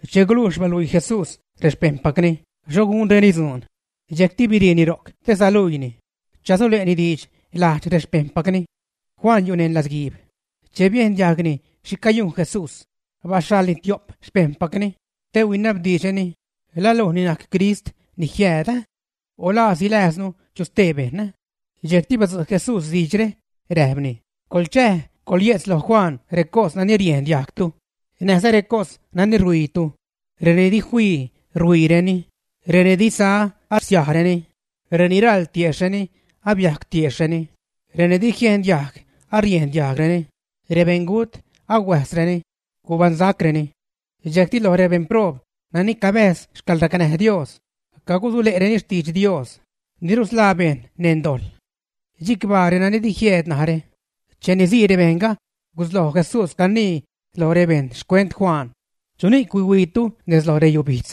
Che gulujx baluii Jesús rexpejṉpacni xho gunreni dzuun, dxejcti biriini ro'c te saluiini, chasule'ni diidx lajdx rexpejṉpacni. Juan yu' neṉ latzguiib. Che biejn diajgni xhi cayujn Jesús, baxhaḻni tio'p xpejṉpacni te huinabdiidxreni: ―¿La luj ni najc Crist ni jiääd, ä?, o ¿la silääznu chu stee bejṉ? Dxejcti badzu' Jesús diidxre räjpni: ―Coḻchäj, coḻye'tz loj Juan recos nani riejn diajgtu, näjza recos nani ruhuiitu. Reni di fii, ruhuiireni; reni di sa, arsiajreni, reni raḻ tiejxhni, abiajc tiejxhreni; reni di jien diajg, ariejn diajgreni; rebeṉgut, ahuäjzreni, gubaṉsacreni. Dxejcti loj rebejṉ proob nani cabäjz xcäḻracnäj Dios cagusule'reni xtidx Dios ni rusḻaa bejṉ neṉ dojḻ. Chicbaa renani di jieed narä. Cheni sii rebejṉga gusloj Jesús canii loj rebejṉ xcuent Juan: ―¿Chuni'c huihuiitu nez loj reyubijdz?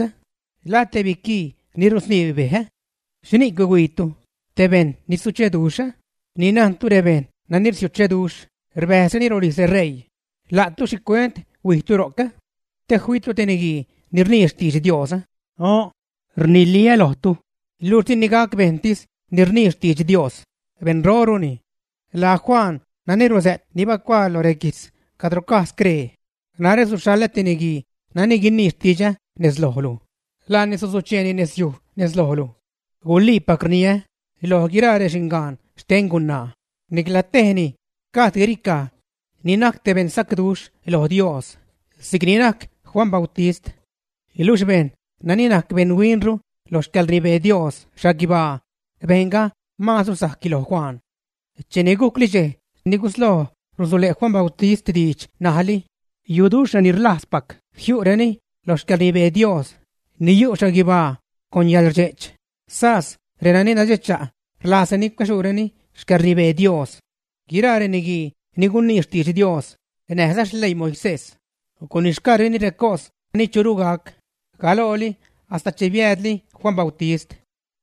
¿La te biquii ni rusniib bej, ä? ¿Xhini'c huihuiitu? ¿Te bejṉ ni sucheduxh, ä? Ni najntu rebejṉ nani sucheduxh rbäjzreni rolijz reṟeii. La'tu ¿xhicuent huijtu ro'c? ¿Te fiitu te niguii ni rnii xtidx Dios, ä? O'n. Rniliä lojtu, luxh dini gac bejṉtis ni rnii xtidx Dios; beṉroruni. Laa Juan nani rusä't ni bacuaa lo reguijtz cadro caj scree: Narä suxhaḻä te niguii nani guinii xtidxä nez lojlu; laani susucheeni nezyuj nezlojlu. Guliipac rniä, loj guiraa rexingaan xten gunaa, nicla tejni gajd guiricaj ni najc te beṉsacduxh loj Dios si'c ni najc Juan Bautist. Niluxh bejṉ nani najc beṉ huinru lo xcäḻrnibee Dios xhaguibaa, bejṉga maazru sajcni loj Juan. ’Cheni gucli dxej ni gusloj rusule' Juan Bautist diidx ṉajli, yu'duxh reni rlajzpac jiu'reni lo xcäḻrnibee Dios ni yu' xhaguibaa con yäḻrdxe'ch, sas reni nadxecha' rlajzreni cuäxuuni xcäḻnibee Dios. Guiraa reniguii ni gunni xtidx Dios näjza xleii Moisés, gunixgaareni recos ni churu gac, galooli hasta che biäädli Juan Bautist.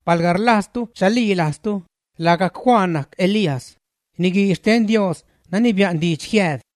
Palga rlajztu chalilajztu, lagajc Juan najc Elías, niguii xten Dios nani bia'n diidx jiääd.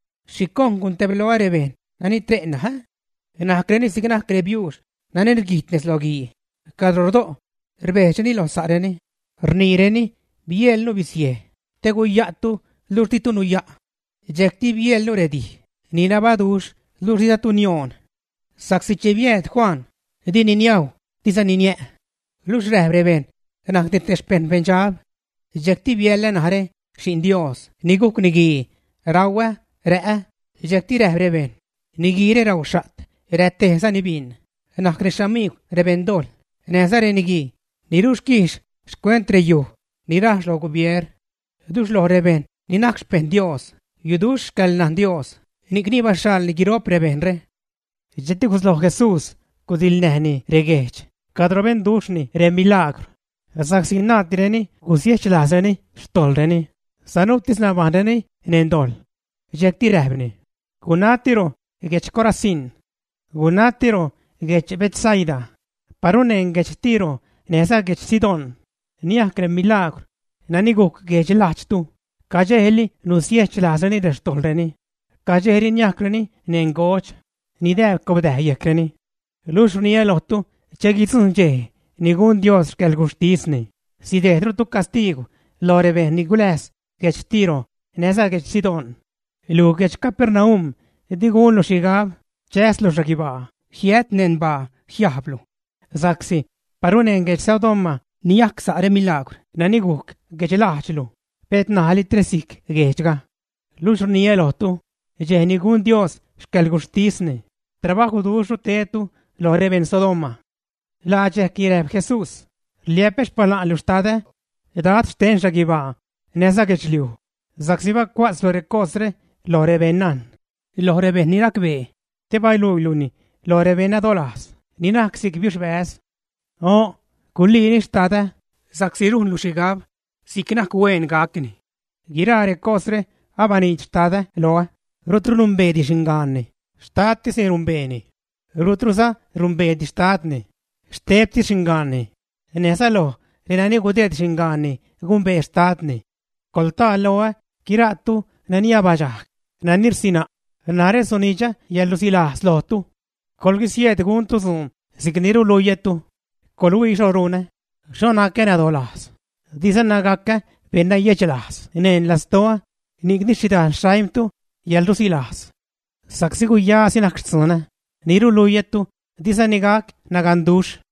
’¿Xhicojn guntebloä rebejṉ nani tre' ṉaj, ä? Najcreni si'c najc rebiuux nani rguijt nez lo guii cadro rdo', rbejdxreni lo sa'reni, rniireni: “Bieḻnu bizej te guya'tu luxh ditu nuya'. Dxejcti bieḻnu redij ni nabaduxh luxh dizatu nioon.” Sa'csi che biääd Juan dini niajw dizani niä', luxh räjp rebejṉ najcni te xpejṉ beṉdxab. Dxejcti biäḻä narä, Xi'n Dios ni gujc Niguii, rauä, rä'ä dxejcti räjp rebejṉ: “Niguiire rauxha't, rätejzani bin, najcni xamigw rebeṉdojḻ näjza reniguii ni ruquijx xcuent reyuj ni rajx lo gubier.” Luxh loj rebejṉ ni najc xpejṉ Dios yuduxh xcäḻnajn Dios, ni'cni baxhaḻni guiro'p rebejṉre. Dxejcti gusloj Jesús gudiḻnäjni rebeṉguejdx cadro benduxhni remilaagwr, sa'csi naaddireni gusiechlajzreni xtojḻreni, sanuutis nabajṉreni neṉ dojḻ. Dxejcti räjpni: ―¡Gunatiru guedx Corazín! ¡Gunatiro guedx Betsaida! Paru neṉ guedx Tiro näjza guedx Sidón niajc remilaagwr nani gujc guedx lajdxtu, cadxejli nusiejch lajzreni xtojḻreni, cadxejli niajcwreni neṉ godx, nidääb cobdäj yejcreni. Luxh rniä lojtu: che guidzujṉ dxej ni gun Dios xcäḻguxhtisni, sidejdrutu castiigw loj rebejṉ ni guläjz guedx Tiro näjza guedx Sidón. Luj guedx Capernaum di gunlu xhigab chäslu xhaguibaa; jiäjt neṉ baa jiajblu, sa'csi paru neṉ guedx Sodoma niajc sa' remilaagwr nani gujc guedxlajdxlu, pet ṉajli tresijc guejdxga. Luxh rniä lojtu, dxej ni gun Dios xcäḻguxhtisni, trabajwduxhru tedtu loj rebejṉ Sodoma. Laa dxejcni räjp Jesús: ―Rliä'pä xpala'nlu Xtadä, Dad xten xhaguibaa näjza guedxliuj, sa'csi bacua'tzlu recosre lo rebeṉnajn, lo rebejṉ ni racbee, te baluiiluni loj rebeṉnadolajz ni najc si'c biuxbäz. O'n. Guliini, Xtadä, sa'csi rujnlu xhigab si'c najc hueen gacni. ’Guiraa recosre abaniidx Xtadä loä, rutru numbeedi xingaanni; xtadtisni rumbeeni. Rutruza numbeedi xtadni, xtebtis xingaanni, näjza loj renani gudeed xingaanni gumbee xtadni. Coḻtaa loä guiraatu nani abadxajg, nani rsina', narä sunidxä yäḻrusilajz lojtu. Coḻguisieed guntu dzuun si'cni ruluiätu. Coḻhuii xho runä, xho nacä nadolajz, dizana gacä beṉnayedxlajz neṉ lastoä, ni'cni sidxäl xaimtu yäḻrusilajz. Sa'csi guyasi najc xtzunä ni ruluiätu, dizani gac naganduxh.